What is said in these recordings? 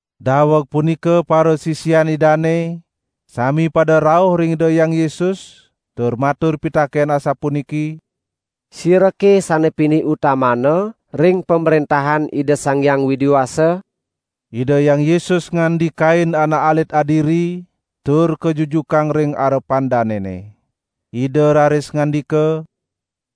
Daweg punika parasisian Idane sami pada rauh ring Ida Hyang Yesus tur matur pitaken asapuniki: "Sirake sane pinih utamana ring Pamrentahan Ida Sang Hyang Widi Wasa?" Ida Hyang Yesus ngandikain anak alit adiri tur kajujukang ring arepan danene. Ida raris ngandika: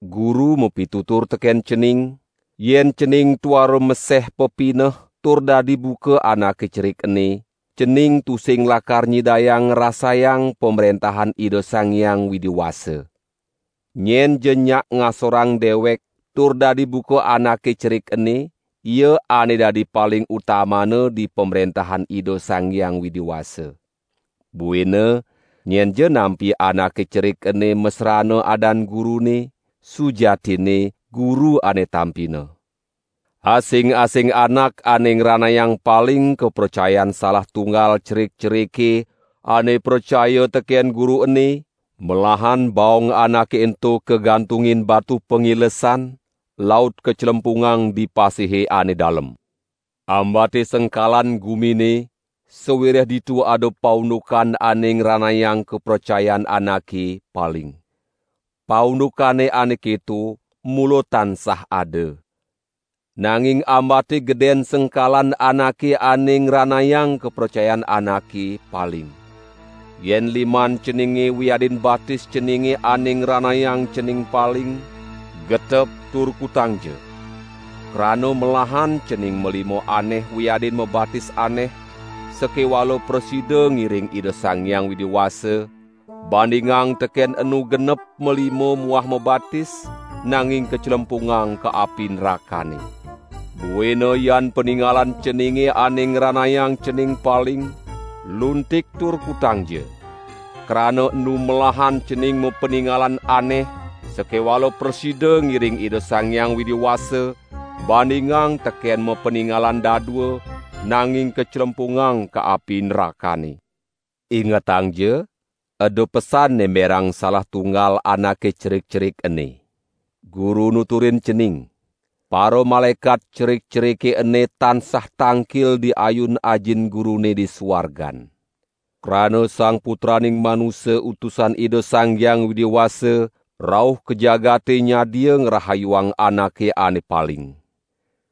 "Guru mapitutur teken cening, yen cening tuara maseh pepineh tur dadi buka anake cerik ene, cening tusing lakar nyidayang ngrasayang Pamrentahan Ida Sang Hyang Widi Wasa. Nyenja nyak ngasorang dewek tur dadi buka anake cerik ene, ia ane dadi paling utamana di Pamrentahan Ida Sang Hyang Widi Wasa. Buina nyenja nampi anake cerik ene masrana adan Gurune, sujatinne Guru ane tampina." "Asing-asing anak ane ngranayang paling kapracayan salah tunggal cerik-cerike ane pracaya teken Guru ene, melahan baong anake ento kagantungin batu pangilesan, laut kaclempungang di pasihe ane dalem. Ambate sengkalan gumine sawireh ditu ada paundukan ane ngranayang kapracayan anake paling. Paundukane ane keto mula tansah ada, nanging ambate geden sengkalan anake ane ngranayang kapracayan anake paling. Yen liman ceninge wiadin batis ceninge ane ngranayang cening paling, getep tur kutangja. Krana melahan cening malima aneh wiadin mabatis aneh sakewala prasida ngiring Ida Sang Hyang Widi Wasa, bandingang teken enu genep malima muah mabatis, nanging kaclempungang ka api nrakane. Buina yan paningalan ceninge ane ngranayang cening paling, luntik tur kutangja. Krana enu melahan cening mapaningalan aneh sakewala prasida ngiring Ida Sang Hyang Widi Wasa, bandingang teken mapaningalan dadua nanging kaclempungang ka api nrakane." "Ingetangja eda pesan nemberang salah tunggal anake cerik-cerik ene. Guru nuturin cening: paramalaekat cerik-cerike ene tansah tangkil di ayu Ajin Gurune di suargan. [ Krana Sang Putraning Manusa Utusan Ida Sang Hyang Widi Wasa rauh ka jagate nyadia ngrahayuang anake ane paling.]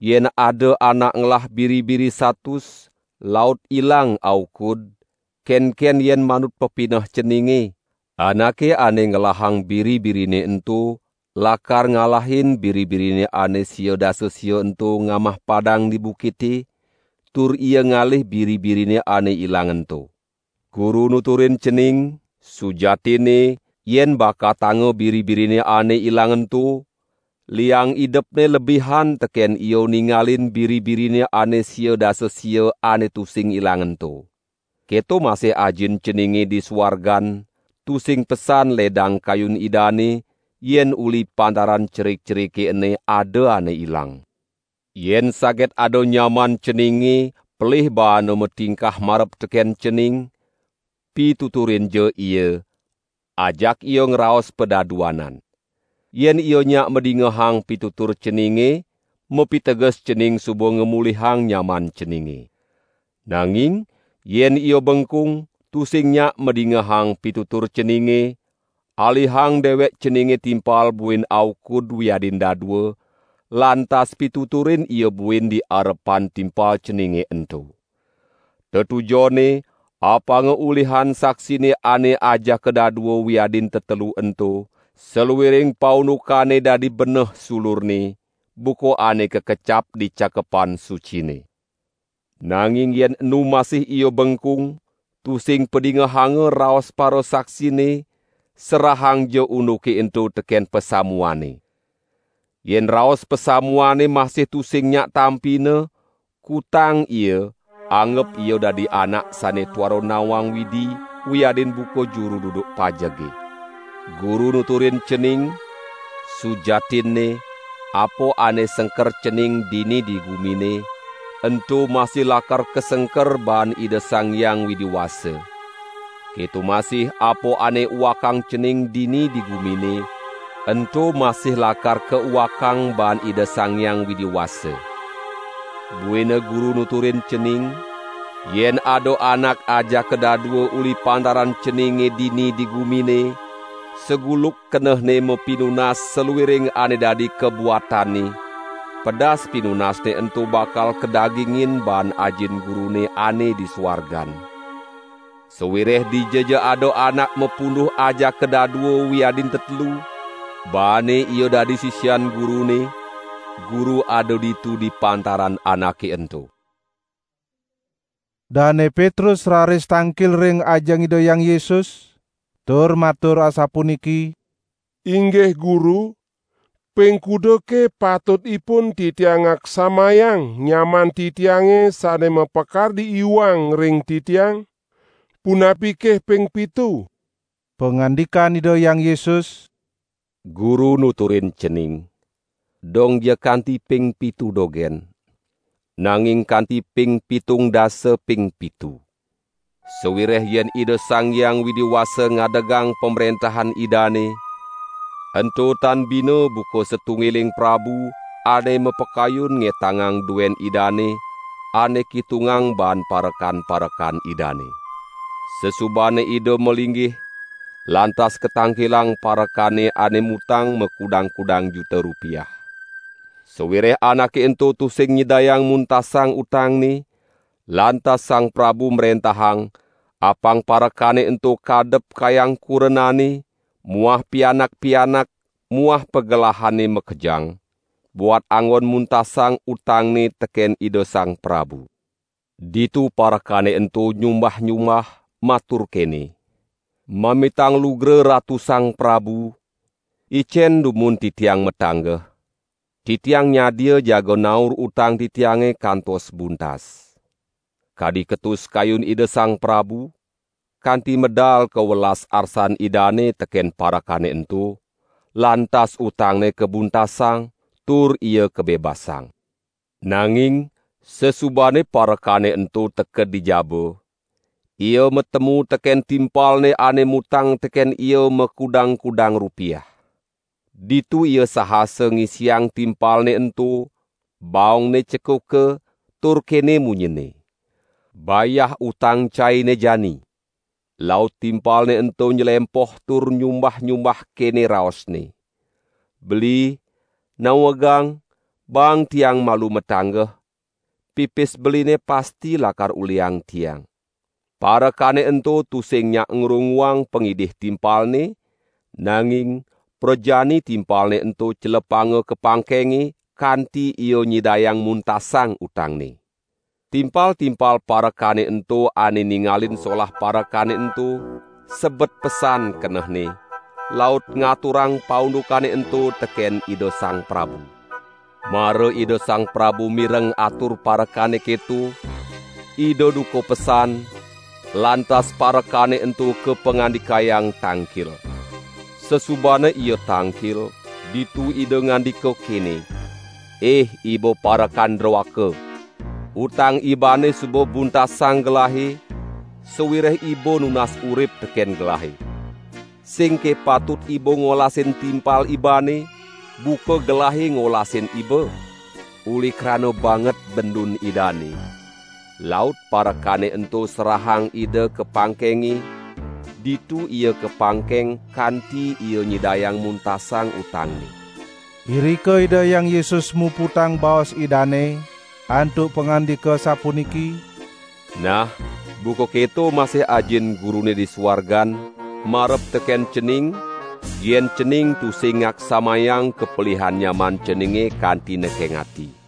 Yen ada anak ngelah biri-biri satus, laut ilang aukud, kenken yen manut pepineh ceninge? Anake ane ngelahang biri-birine ento lakar ngalahin biri-birine ane sangang dasa sia ento ngamah padang di bukite, tur ia ngalih biri-birine ane ilang ento. Guru nuturin cening: Sujatinne, yen bakatanga biri-birine ane ilang ento, liang idepne lebihan teken ia ningalin biri-birine ane sia dasa sia ane tusing ilang ento. Keto masih Ajin ceninge di suargan, tusing pesan ledang kayun Idane yen uli pantaran cerik-cerike ene ada ane ilang." "Yen saget ada nyaman ceninge pelih baana matingkah marep teken cening, pituturinja ia, ajak ia ngraos padaduanan. Yen ia nyak madingehang pitutur ceninge, mapiteges cening suba ngamulihang nyaman ceninge. Nanging yen ia bengkung, tusing nyak madingehang pitutur ceninge, alihang dewek ceninge timpal buin aukud wiadin dadua, lantas pituturin ia buin di arepan timpal ceninge ento. Tetujonne apanga ulihan saksine ane ajaka dadua wiadin tetelu ento saluiring paundukane dadi beneh sulurne, buka ane kakecap di Cakepan Sucine. Nanging yen enu masih ia bengkung, tusing padingehanga raos parasaksine, serahangja unduke ento teken pasamuane. Yen raos pasamuane masih tusing nyak tampina, kutang ia anggep ia dadi anak sane tuara nawang Widi wiadin buka juru duduk pajege." "Guru nuturin cening: Sujatinne apa ane sengker cening dini di gumine, ento masih lakar kasengker baan Ida Sang Hyang Widi Wasa. Keto masih apa ane uakang cening dini di gumine, ento masih lakar kauakang baan Ida Sang Hyang Widi Wasa. Buina Guru nuturin cening: Yen ada anak ajaka dadua uli pantaran ceninge dini di gumine saguluk kenehne mapinunas saluiring ane dadi kabuatanne, pedas pinunasne ento bakal kadagingin baan Ajin Gurune ane di suargan. Sawireh dijaja ada anak mapunduh ajaka dadua wiadin tetelu baane ia dadi sisian Gurune, Guru ada ditu di pantaran anake ento." Dane Petrus raris tangkil ring ajeng Ida Hyang Yesus tur matur asapuniki: "Inggih Guru, ping kudake patutipun titiang ngaksamayang nyaman titiange sane mapakardi iwang ring titiang? Punapike ping pitu?" Pangandikan Ida Hyang Yesus: "Guru nuturin cening, dongja kanti ping pitu dogen, nanging kanti ping pitung dasa ping pitu. Sawireh yen Ida Sang Hyang Widi Wasa ngadegang Pamrentahan Idane, ento tan bina buka satunggiling prabu ane mapakayun ngetangang duen idane ane kitungang baan parekan-parekan idane. Sasubane ida malinggih, lantas katangkilang parekane ane mutang makudang-kudang juta rupiah. Sawireh anake ento tusing nyidayang muntasang utangne, lantas sang prabu mrentahang apang parekane ento kadep kayang kurenane muah pianak-pianak muah pagelahane makejang, buat anggon muntasang utangne teken ida sang prabu. Ditu parekane ento nyumbah-nyumbah matur kene: 'Mamitang lugra ratu sang prabu, icen dumun titiang matanggeh. Titiang nyadia jaga naur utang titiange kantos buntas.' Kadi ketus kayun ida sang prabu, kanti medal kawelas arsan idane teken parekane ento, lantas utangne kabuntasang, tur ia kabebasang. Nanging sasubane parekane ento teked di jaba, ia matemu teken timpalne ane mutang teken ia makudang-kudang rupiah. Ditu ia sahasa ngisiang timpalne ento, baongne cekuka tur kene munyinne: 'Bayah utang caine jani!' Laut timpalne ento nylempoh tur nyumbah-nyumbah kene raosne: 'Beli, nawegang baang tiang malu matanggeh, pipis beline pasti lakar ulihang tiang.' Parekane ento tusing nyak ngrunguang pangidih timpalne, nanging prajani timpalne ento celepanga ka pangkenge, kanti ia nyidayang muntasang utangne. Timpal-timpal parekane ento ane ningalin solah parekane ento, sebet pesan kenehne, laut ngaturang paundukane ento teken ida sang prabu. Mara ida sang prabu mireng atur parekane keto, ida duka pesan, lantas parekane ento kapangandikayang tangkil. Sasubane ia tangkil, ditu ida ngandika kene: 'Ih iba parekan droaka, utang ibane suba buntasang gelahe, sawireh iba nunas urip teken gelahe. Singke patut iba ngolasin timpal ibane buka gelahe ngolasin iba?' Uli krana banget bendun idane, laut parekane ento serahang ida ka pangkenge, ditu ia kapangkeng kanti ia nyidayang muntasang utangne." Irika Ida Hyang Yesus muputang baos Idane, antuk pangandika sapuniki: "Nah buka keto masih Ajin Gurune di suargan, marep teken cening, yen cening tusing ngaksamayang kapelihan nyaman ceninge kanti nekeng ati."